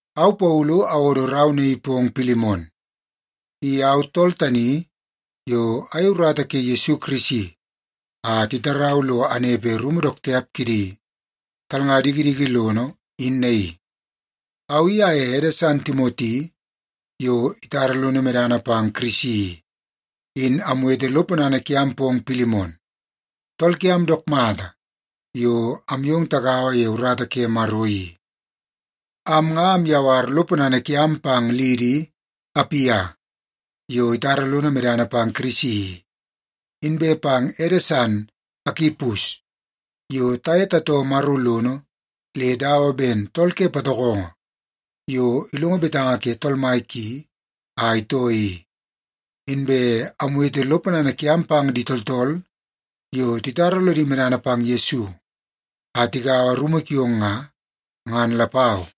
Au Paulu awodo rau naii pong Pilimon. I au tool tani yo ayei urata ke Yesu Kirisi a titarau lo anepe rumu dook tiap kidi talnga dikidiki lono in naii. Au i aye ede san Timoti yo itara lono medana pang Kirisi i, in amwete lo ponana kiam pong Pilimon, tool kiam dook mata yo amyong tagaua ye urata ke Maro i. Am nga amyawar lo ponana kiam pang liidi, Apia, yo itara lono medana pang Kirisi i, inbe pang ede san, Akipus, yo taye tatoo Maro lono le dawa ben tool ke patokongo yo ilongo betanga ke tool mai ki a itoo i. Inbe amwete lo ponana kiam pang di tooltool yo titara lodi medana pang Yesu a tigaua rumu kiong nga, ngan lapau.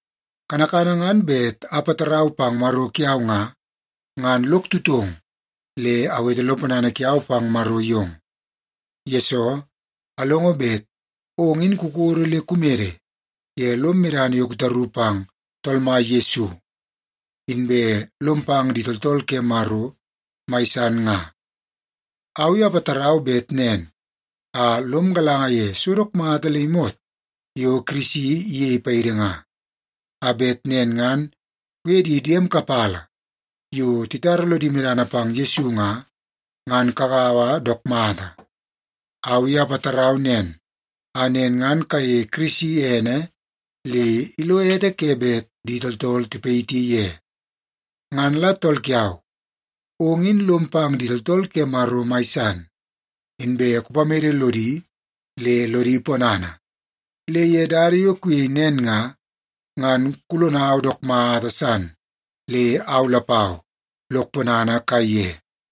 Kanakana ngan bet apatarau pang Maro kiau nga, ngan lok tutong le awete lo ponana kiau pang Maro yong. Yesoo, alongo bet ong in kukodo le kumede ye lom medana yo kutaru pang Tool Mai Yesu, inbe lom pang di tooltool ke Maro mai san nga. Au i apatarau bet nen a lom galanga ye so dook mata le imot yo Kirisi iyei paidi nga, a bet nen ngan kuye di diem kapala yo titara lodi medana pang Yesu nga, ngan kagaua dook mata. Au i apatarau nen a nen ngan kayeie Kirisi ene le ilo ete ke bet di tooltool tipayiti ye. Ngan la tool kiau, ong in lom pang di tooltool ke Maro mai san, inbe kupamede lodi le lodi ponana. Le ye dada yo kuyei nen nga, ngan kulonau dook mata san le au lapau lok ponana kaiye.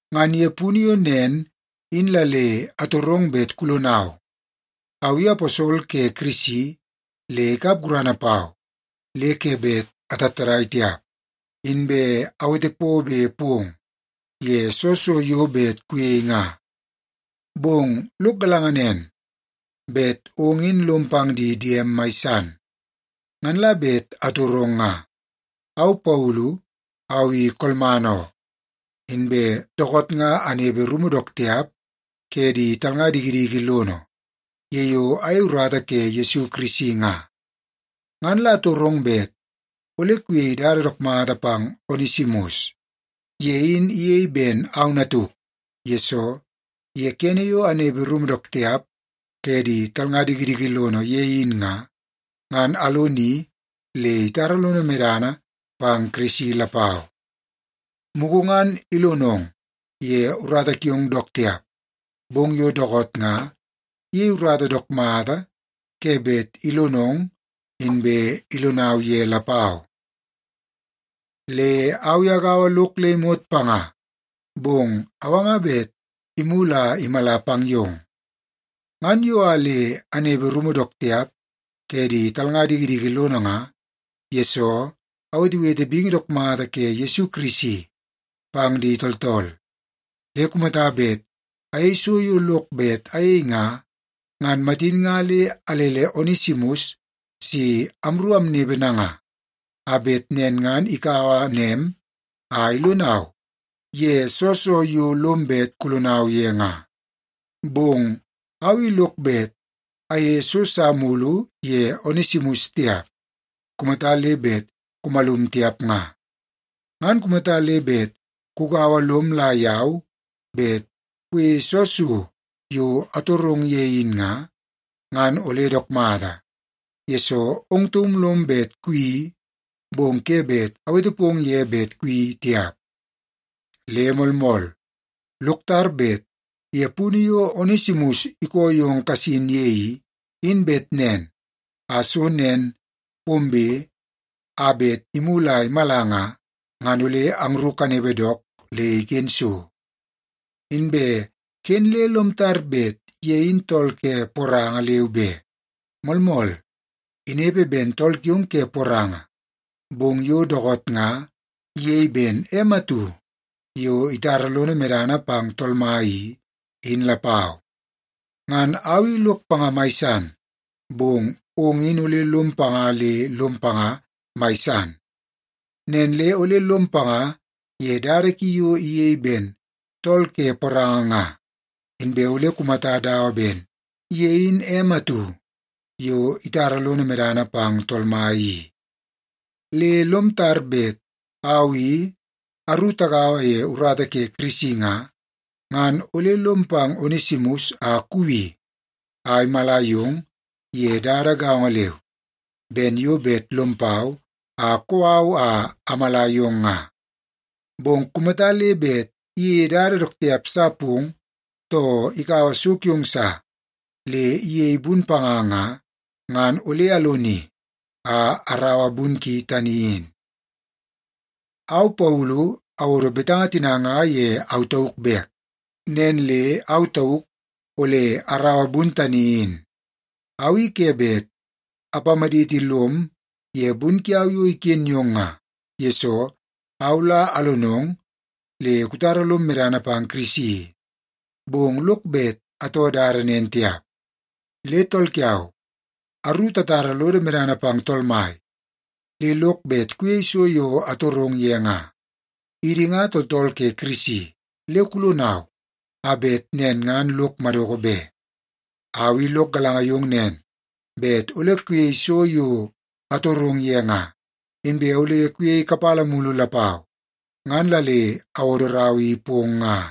Ngan ye punu yo nen in la le atorong bet kulonau. Au i aposol ke Kirisi le ikap gurana pau le ke bet atattadai tiap, inbe awete pobe pong ye soo so yo bet kuyei nga. Bong lok galanga nen, bet ong in lom pang di diem mai san, ngan la bet atorong nga. Au Paulu, au i kolman oo, inbe dookoot nga anepe rumu dook tiap ke di talnga dikidiki lono ye yo ayei urata ke Yesu Kirisi nga. Ngan la atorong bet ole kuyei dada dook mata pang Onesimus. Ye in iyei ben au natuk, yesoo ye kene yo anepe rumu dook tiap ke di talnga dikidiki lono ye in nga, ngan aloni le itara lono medana pang Kirisi lapau. Mugu ngan ilonong ye urata kiong dook tiap, bong yo dookoot nga iyei urata dook mata ke bet ilonong inbe ilonau ye lapau. Le au i agaua lok le imot panga, bong awanga bet imulu a imala pang yong. Ngan yo a le anepe rumu dook tiap ke di talnga dikidiki lono nga, yesoo awetewete bingi dook mata ke Yesu Kirisi pang di tooltool. Le kumata bet ayei so yo lok bet ayei nga, ngan matin nga le alele Onesimus si amru amnepe nanga, a bet nen ngan ikaua nem a ilonau ye soo so yo lom bet kulonau ye nga. Bong au i lok bet ayeie so sa mulu ye Onesimus tiap kumata le bet kumalum tiap nga. Ngan kumata le bet kugaua lom la yau bet kuyeie soo so yo atorong ye in nga, ngan ole dook mata, yesoo ong taum lom bet kuyeii, bong ke bet awete pong ye bet kuyeii tiap. Le moolmool, lok tar bet ye punu yo Onesimus ikoo yong kasin ye i, in bet nen a so nen pombe a bet imulu a imala nga, ngan ole angru kanepe dook le iken so. Inbe ken le lom tar bet ye in tool ke poranga leu be. Moolmool, inepe ben tool kiong ke poranga, bong yo dookoot nga iyei ben em atu yo itara lono medana pang Tool Mai i, in lapau. Ngan au i lok panga mai san, bong ong in ole lom panga le lom panga mai san. Nen le ole lom panga ye dada ki yo iyei ben tool ke poranga nga, inbe ole kumata dawa ben ye in em atu yo itara lono medana pang Tool Mai i. Le lom tar bet au i aru tagaua ye urata ke Kirisi nga, ngan ole lom pang Onesimus a kuwi a imala yong ye dada gaongo leu ben yo bet lom pau a kou au a amala yong nga. Bong kumata le bet iyeie dada dook tiap sa pong, too ikaua so kiong sa le iyei bun panga nga, ngan ole aloni a araua bun ki tani in. Au Paulu awodo betanga tina nga ye au tauk bek. Nen le au tauk ole araua bun tani in. Au i ke bet apamaditi lom ye bun kiau yo iken yong nga, yesoo au la alonong le kutara lom medana pang Kirisi i, bong lok bet atoo dada nen tiap. Le tool kiau, aru tatara lodo medana pang Tool Mai, le lok bet kuyei so yo atorong ye nga. Idi nga tooltool ke Kirisi, le kulonau a bet nen ngan lok madoko be. Au i lok galanga yong nen, bet ole kuyei so yo atorong ye nga, inbe ole kuyei kapala mulu lapau, ngan la le awodo rau i pong nga.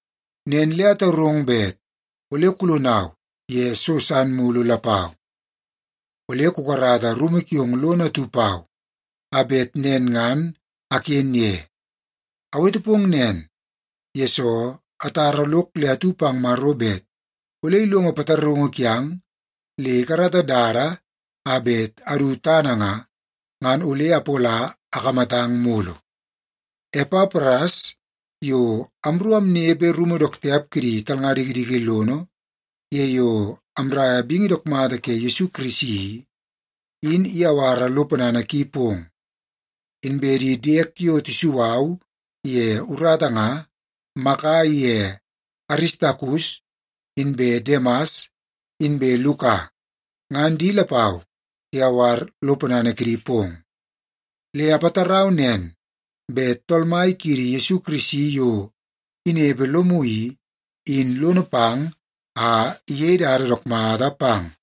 Nen le atorong bet ole kulonau ye so san mulu lapau. Ole kukarata rumu kiong lono atu pau a bet nen ngan aken ye. Awete pong nen, yesoo atara lok le atu pang Maro bet ole ilongo pataraungu kiang le ikarata dada a bet adu tana nga, ngan ole apola akamatang mulu. Epapras, yo amru amnepe rumu dook tiap kidi talnga dikidiki lono ye yo amraia bingi dook mata ke Yesu Kirisi i, in iyawara lo ponana ki pong. Inbe di diek yo tisu au ye urata nga, Maka iye Aristakus inbe Demas inbe Luka, ngan di lapau tiyawar lo ponana kidi pong. Le apatarau nen bet Tool Mai kiidi Yesu Kirisi yo inepe lomu i, in lono pang a iyei dada dook mata pang.